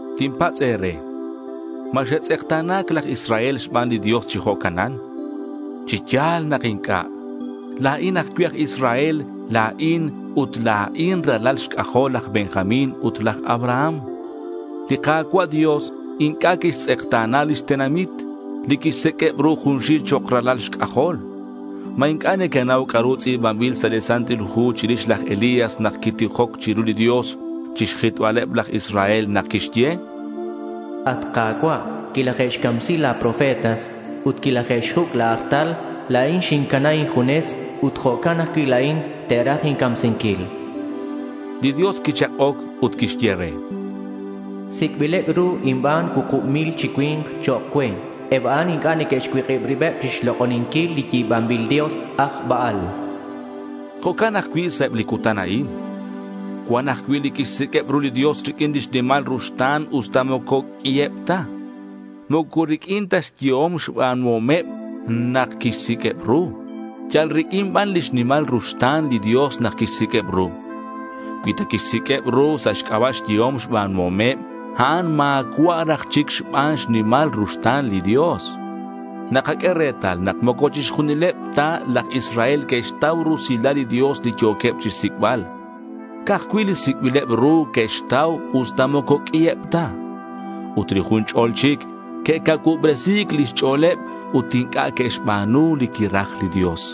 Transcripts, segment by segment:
Tinpatz' e̱re, ¿ma xe'tz'ekta̱na̱c laj Israel xban li Dios chi jo'canan? ¡Chi ya̱l nak inc'a'! La̱in ajcui' aj Israel la̱in ut la̱in ralal xc'ajol laj Benjamín ut laj Abraham. Li Ka̱cua' Dios inc'a' quixtz'ekta̱na lix tenamit, li quixsiq'ueb ru junxil chok' ralal xc'ajol. ¿Ma inc'a' nequenau c'a'ru tz'i̱banbil sa' li Santil Hu chirix laj Elías nak quitijoc chiru li Dios chixjitbaleb laj Israel? Quixye: At Ka̱cua', quilaje'xcamsi la̱ profetas ut quilaje'xjuc' la̱ artal; la̱in xincana injunes ut jo'can ajcui' la̱in, te'raj incamsinquil. Li Dios quichak'oc ut quixye re: Sic'bileb ru inban cuukub mil chi cui̱nk chok' cue. Eb a'an inc'a' que'xcuik'ib ribeb chixlok'oninquil li yi̱banbil dios aj Baal, chan. Jo'can ajcui' sa' eb li cutan a'in. Cuan ajcui' li quixsiq'ueb ru li Dios riq'uin lix nimal ruxta̱n usta moco q'uiheb ta. Moco riq'uin ta xyehom xba̱nuhomeb nak quixsiq'ueb ru. Yal riq'uin ban lix nimal ruxta̱n li Dios nak quixsiq'ueb ru. Cui ta quixsiq'ueb ru sa' xc'aba' xyehom xba̱nuhomeb, a'an ma̱cua' raj chic xban xnimal ruxta̱n li Dios. Nakaq'ue retal nak moco chixjunileb ta laj Israel que'xtau rusilal li Dios li yo̱queb chixsic'bal. Ca'aj cui' li sic'bileb ru que'xtau, usta moco q'ui eb ta. Ut li jun ch'o̱l chic que'cacuubresi̱c lix ch'o̱leb ut inc'a' que'xba̱nu li quiraj li Dios.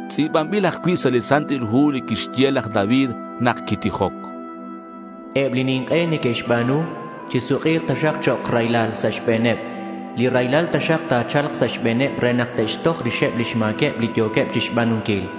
Tz'i̱banbil ajcui' sa' li Santil Hu li quixye laj David nak quitijoc: Eb li nink'e neque'xba̱nu chisuk'i̱k taxak chok' raylal sa' xbe̱neb. Raylal taxak ta̱cha̱lk sa' xbe̱neb re nak te'xtoj rixeb lix ma̱queb li yo̱queb chixba̱nunquil.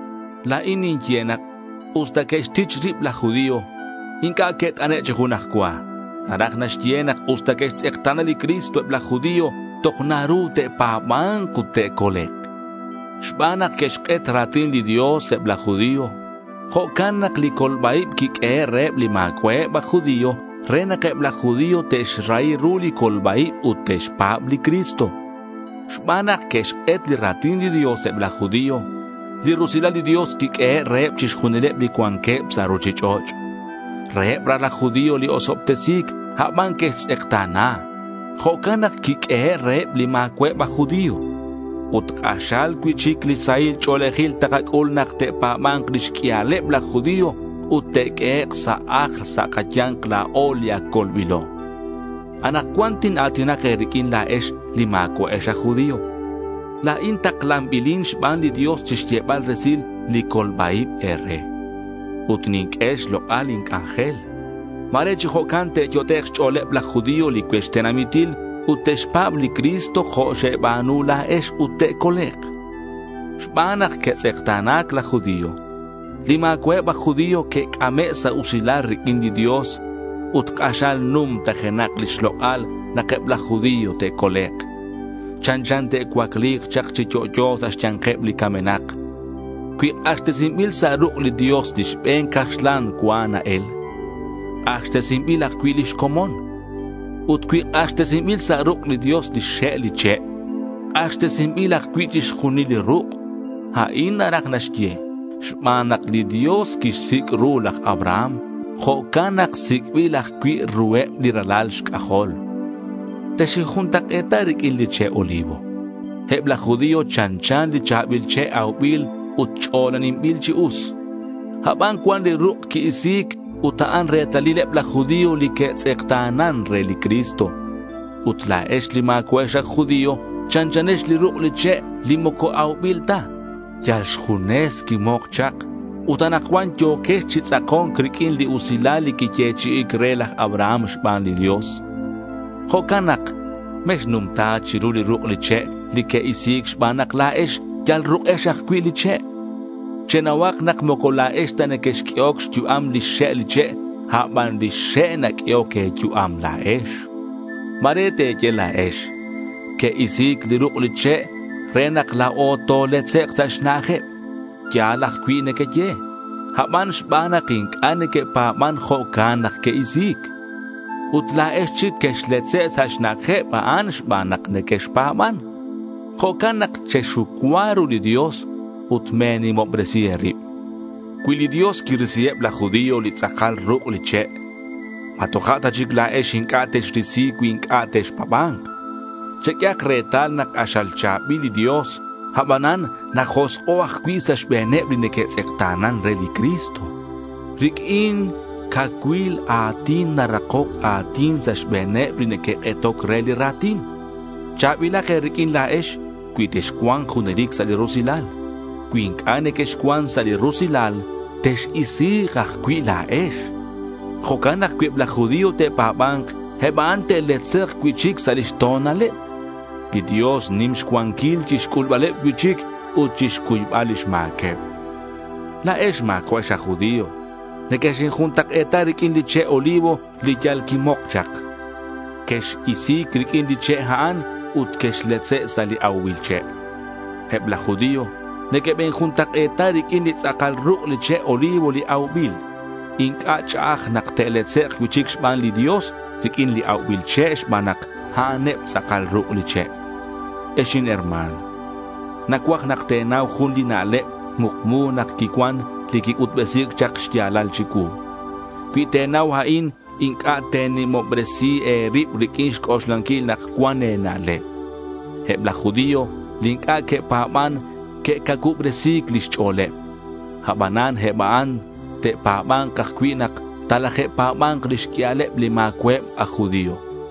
La̱in ninye nak usta que'xtich rib laj judío, inc'a' que't'ane' chi junaj cua. Naraj naxye nak usta que'xtz'ekta̱na li Cristo eb laj judío toj naru te'pa̱ba̱nk ut te'colek'. Xban nak que'xk'et ra̱tin li Dios eb laj judío, jo'can nak li colba-ib quiq'uehe' reheb li ma̱cua'eb aj judío re nak eb laj judío te'xrahi ru li colba-ib ut te'xpa̱b li Cristo. Xban nak que'xk'et li ra̱tin li Dios eb laj judío, li rusilal li Dios quiq'uehe' reheb chixjunileb li cuanqueb sa' ruchich'och'. Reheb raj laj judío li osobtesi̱c, aban que'xtz'ekta̱na. Jo'can nak quiq'uehe' reheb li ma̱cua'eb aj judío. Ut k'axal cui'chic li sahil ch'o̱lejil takac'ul nak te'pa̱ba̱nk lix q'uialeb laj judío ut te'q'uehek' sa' ajl sa' kaya̱nk la̱o li ac colbilo. Anakcuan tina̱tinak e̱riq'uin la̱ex li ma̱cua'ex aj judío. La̱in taklanbilin xban li Dios chixyebal resil li colba-ib e̱re. Ut ninq'ue xlok'al lin c'anjel. Ma̱re chi jo'can te'yot'ek' xch'o̱leb laj judío li cuech tenamitil ut te'xpa̱b li Cristo jo' xeba̱nu la̱ex ut te'colek'. Xban nak que'tz'ekta̱na̱c laj judío, li ma̱cua'eb aj judío que'c'ame' sa' usilal riq'uin li Dios. Ut k'axal numtajenak li xlok'al nak eb laj judío te'colek'. Chanchan te'cuacli̱k chak chi yo'yo sa' xya̱nkeb li camenak. Cui k'axtesinbil sa' ruk' li Dios li xbe̱n caxlan cua na-el, k'axtesinbil ajcui' lix comon. Ut cui k'axtesinbil sa' ruk' li Dios lix xe' li che', k'axtesinbil ajcui' chixjunil li ruk'. A'in naraj naxye: Xban nak li Dios quixsic' ru laj Abraham, jo'can nak sic'bil ajcui' ruheb li ralal xc'ajol. Texinjuntak'e̱ta riq'uin li che' olivo. Eb laj judío chanchan li cha̱bil che' aubil ut ch'olaninbil chi us. Aban cuan li ruk' qui-isi̱c ut a'an retalil eb laj judío li que'tz'ekta̱nan re li Cristo. Ut la̱ex li ma̱cua'ex aj judío chanchanex li ruk' li che' li moco aubil ta. Yal xjunes quimok chak. Ut anakcuan yo̱quex chi tz'ako̱nc riq'uin li usilal li quiyechi'i̱c re laj Abraham xban li Dios. Jo'can nak mexnumta chiru li ruk' li che' li que'isi̱c xban nak la̱ex yal ruk'ex ajcui' li che'. Chenauhak nak moco la̱ex ta nequexq'uehoc xyu'am lix xe' li che', aban lix xe' naq'uehoc e̱yu'am la̱ex. Ma̱re te̱ye la̱ex, que'isi̱c li ruk' li che' re nak la̱o toletzek' sa' xna'ajeb. Ya̱l ajcui' nequeye, aban xban nak inc'a' neque'pa̱ban jo'can nak que'isi̱c. Ut la̱ex chic quexletze' sa' xna'ajeb a'an xban nak nequexpa̱ban. Jo'can nak chexucua ru li Dios ut me̱nimobresi e̱rib. Cui li Dios quirisi eb laj judío, li tz'akal ruk' li che', ¿ma toja' ta chic la̱ex inc'a' texrisi cui inc'a' texpa̱ba̱nk? Cheq'uehak retal nak k'axal cha̱bil li Dios, abanan najosk'o' ajcui' sa' xbe̱neb li neque'tz'ekta̱nan re li Cristo. Riq'uin cacuil a̱tin narakoc a̱tin sa' xbe̱neb li neque'k'etoc re li ra̱tin. Cha̱bilak e̱riq'uin la̱ex cui texcua̱nk junelic sa' li rusilal. Cui inc'a' nequexcuan sa' li rusilal tex-isi̱k ajcui' la̱ex. Jo'can nak cui eb laj judío te'pa̱ba̱nk, eb a'an te'letzek' cui'chic sa' lix to̱naleb. Li Dios nim xcuanquil chixc'ulbaleb cui'chic ut chixcuybal lix ma̱queb. La̱ex ma̱cua'ex aj judío, nequexinjuntak'e̱ta riq'uin li che' olivo li yal quimok chak. Quex-isi̱c riq'uin li che' a'an ut quexletze' sa' li aubil che'. Eb laj judío nequebinjuntak'e̱ta riq'uin li tz'akal ruk' li che' olivo li aubil. Inc'a' ch'a'aj nak te'letzek' cui'chic xban li Dios riq'uin li aubil che' xban nak a'aneb tz'akal ruk' li che'. Ex herma̱n, nacuaj nak te̱nau jun li na'leb mukmu nak quicuan, li quic'utbesi̱c chak xya̱lal chicuu. Cui te̱nau a'in inc'a' te̱nimobresi e̱rib riq'uin xc'oxlanquil nak cuan e̱na'leb. Eb laj judío li inc'a' que'pa̱ban que'cacuubresi̱c lix ch'o̱leb. Abanan eb a'an te'pa̱ba̱nk ajcui' nak talaje'pa̱ba̱nk lix q'uialeb li ma̱cua'eb aj judío.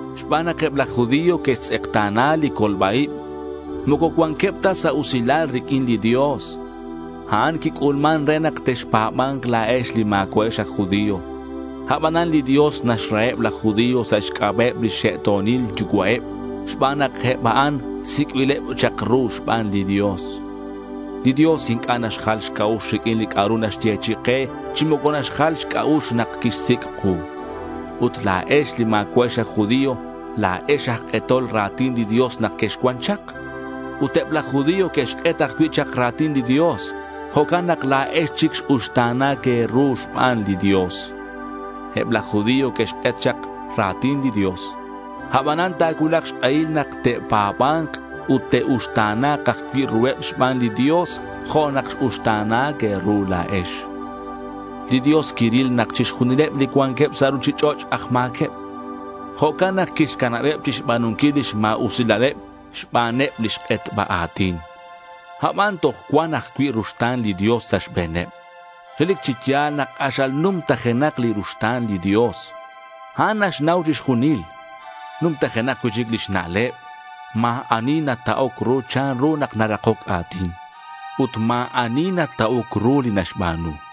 Xban nak eb laj judío que'xtz'ekta̱na li colba-ib, moco cuanqueb ta sa' usilal riq'uin li Dios. A'an quic'ulman re nak texpa̱ba̱nk la̱ex li ma̱cua'ex aj judío. Abanan li Dios naxraheb laj judío sa' xc'aba'eb lix xe'to̱nil yucua'eb xban nak eb a'an ac sic'bileb chak ru xban li Dios. Li Dios inc'a' naxjal xc'a'ux riq'uin li c'a'ru naxyechi'i ke, chi moco naxjal xc'a'ux nak quixsic' ku. Ut la̱ex, li ma̱cua'ex aj judío, la̱ex aj k'etol ra̱tin li Dios nak quexcuan chak. Ut eb laj judío que'xk'et ajcui' chak ra̱tin li Dios. Jo'can nak la̱ex chic x-uxta̱na̱c e̱ru xban li Dios. Eb laj judío que'xk'et chak ra̱tin li Dios. Abanan ta̱cuulak xk'ehil nak te'pa̱ba̱nk ut te'uxta̱na̱k ajcui' ruheb xban li Dios jo' nak x-uxta̱na̱c e̱ru la̱ex. Li Dios quiril nak chixjunileb li cuanqueb sa' ruchich'och' aj ma̱queb. Jo'can nak quixcanabeb chixba̱nunquil lix ma̱usilaleb xbaneb lix k'etba a̱tin. Aban toj cuan ajcui' ruxta̱n li Dios sa' xbe̱neb. Relic chi ya̱l nak k'axal numtajenak li ruxta̱n li Dios. A'an naxnau chixjunil. Numtajenak cui'chic lix na'leb. Ma̱ ani nata'oc ru chanru nak narakoc a̱tin. Ut ma̱ ani nata'oc ru li naxba̱nu.